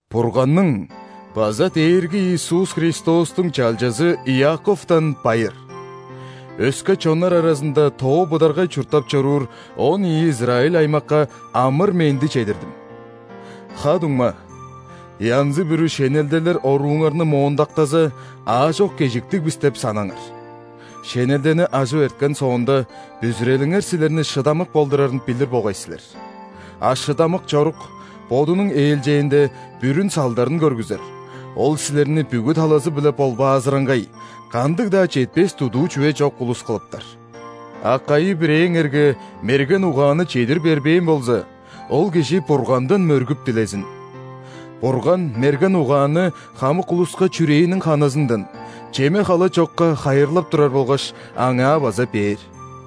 Бурганның база Дээрги Иисус Христостуң чалчазы Иаковтан байыр. Өске чоннар аразында тоо быдаргай чурттап чоруур он ийи израиль аймакка амыр-менди чедирдим! Ха-дуңма, янзы-бүрү шенелделер орууңарны моондактаза, аажок кежиктиг бис деп санаңар! Шенелдени ажып эрткен соонда, бүзүрелиңер силерни шыдамык болдурарын билир болгай силер. А шыдамык чорук, бодунуң ээлчээнде, бүрүн салдарын көргүзер, ол силерни бүгү талазы-биле ·болбаазыраңгай, кандыг-даа четпес-дудуу чүве чок улус кылыптар. А кайы-бирээңерге мерген угаанны чедир бербээн болза, ол кижи Бургандан мөргүп дилезин. Бурган мерген угаанны хамык улуска чүрээниң ханызындан, чеме-хала чокка хайырлап турар болгаш, аңаа база бээр.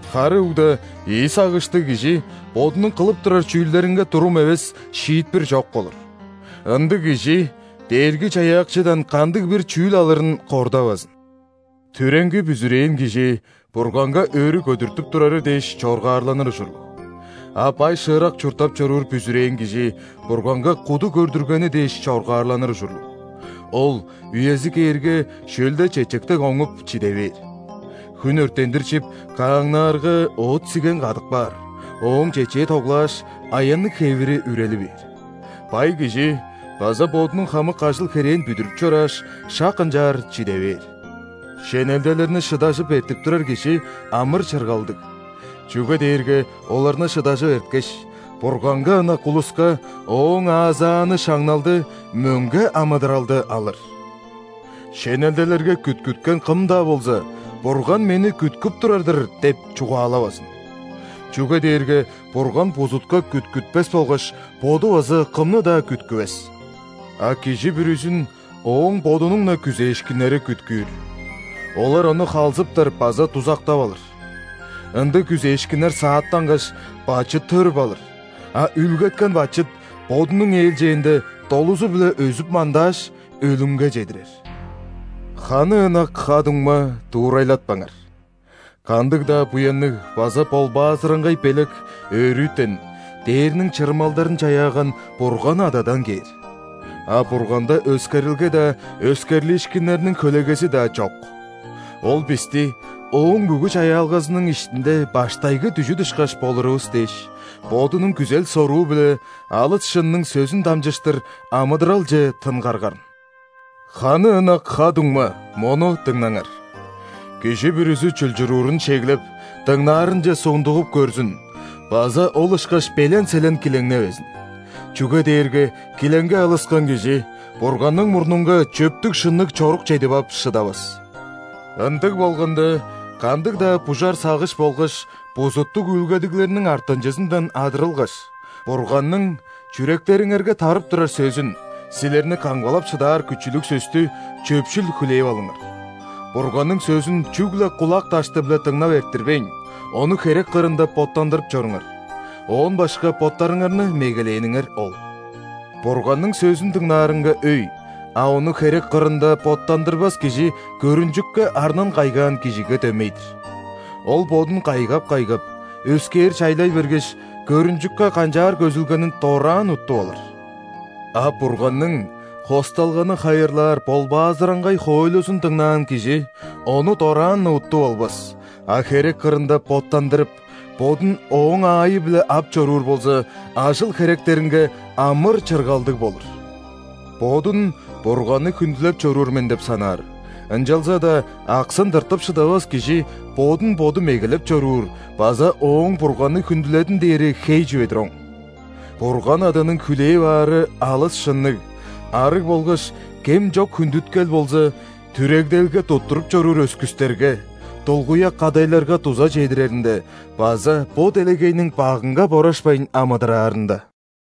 Хары угда ийи сагыштыг кижи бодунуң кылып турар чүүлдеринге турум эвес, шиитпир чок болур. Ындыг кижи Дээрги-Чаяакчыдан кандыг-бир чүүл алырын кордавазын. Түреңги бүзүрээн кижи Бурганга өрү көдүртүп турары дээш чоргаарланыр ужурлуг. А бай-шыырак чурттап чоруур бүзүрээн кижи Бурганга куду көрдүргени дээш чоргаарланыр ужурлуг: ол, үези кээрге, шөлде чечек дег оңуп, чиде бээр. Хүн өрттендир чип, кааңнаарга, оът-сиген кадып каар, ооң чечээ тоглааш, аянныг хевири үрели бээр. Бай кижи база бодунуң хамык ажыл-херээн бүдүрүп чорааш, шак ынчаар чиде бээр. Шенелделерни шыдажып эртип турар кижи амыр-чыргалдыг, чүге дээрге оларны шыдажып эрткеш, Бурганга ынак улуска Ооң аазааны шаңналды – мөңге амыдыралды алыр. Шенелделерге күткүткен кым-даа болза: «Бурган мени күткүп турар-дыр» – деп чугаалавазын. Чүге дээрге Бурган бузутка күткүтпес болгаш Боду база кымны-даа күткүвес. А кижи бүрүзүн ооң бодунуң-на күзээшкиннери күткүүр. Олар ону халзыптар база дузактап алыр. Ындыг күзээшкиннер сааттангаш, бачыт төрүп алыр, а үүлгеткен бачыт, бодунуң ээлчээнде, долузу-биле өзүп-мандааш, өлүмге чедирер. Ханы ынак ха-дуңма, дуурайлатпаңар. Кандыг-даа буянныг база ·болбаазыраңгай белек өрүтен, дээрниң чырымалдарын чаяаган Бурган Ададан кээр. А Бурганда өскерилге-даа, өскерлиишкиннерниң хөлегези-даа чок. Ол бисти, Ооң бүгү чаяалгазының иштинде баштайгы дүжүт ышкаш болурувус дээш, Бодунуң күзел-соруу-биле алыс шынның сөзүн дамчыштыр амыдыралче тынгарган. Ханы ынак ха-дуңма, мону дыңнаңар: кижи бүрүзү чулчуруурун шеглеп, дыңнаарынче сундугуп көрзүн база ол ышкаш белен-селен килеңневезин. Чүге дээрге килеңге алыскан кижи Бурганның мурнунга чөптүг-шынныг чорук чедип ап шыдавас. Ындыг болганда, кандыг-даа бужар сагыш болгаш бузуттуг үүлгедиглерниң артынчызындан адырылгаш, Бурганның чүректериңерге тарып турар сөзүн – силерни камгалап шыдаар күчүлүг сөстү – чөпшүл хүлээп алыңар. Бурганның сөзүн чүгле кулак дашты-биле дыңнап эрттирбейн, ону херек кырында боттандырып чоруңар. Оон башка боттарыңарны мегелээниңер ол. Бурганның сөзүн дыңнаарынга өй, а ону херек кырында боттандырбас кижи көрүнчүкке арнын кайгаан кижиге дөмей-дир. Ол бодун кайгап-кайгап, өскээр чайлай бергеш, көрүнчүкке канчаар көзүлгенин дораан уттуп алыр. А Бурганның хосталганы хайырлаар ·болбаазыраңгай хоойлузун дыңнаан кижи ону дораан-на уттуп албас, а херек кырында боттандырып, бодун ооң аайы-биле ап чоруур болза, ажыл-херектеринге амыр-чыргалдыг болур. Бодун Бурганны хүндүлеп чоруур мен деп санаар, ынчалза-даа аксын тыртып шыдавас кижи бодун боду мегелеп чоруур база ооң Бурганны хүндүледим дээри хей чүве-дир оң. Бурган Аданың хүлээп аары алыс шынныг, арыг болгаш кем чок хүндүткел болза түрегделге туттуруп чоруур өскүстерге, дулгуяк кадайларга дуза чедиреринде база бо делегейниң багынга борашпайн амыдыраарында.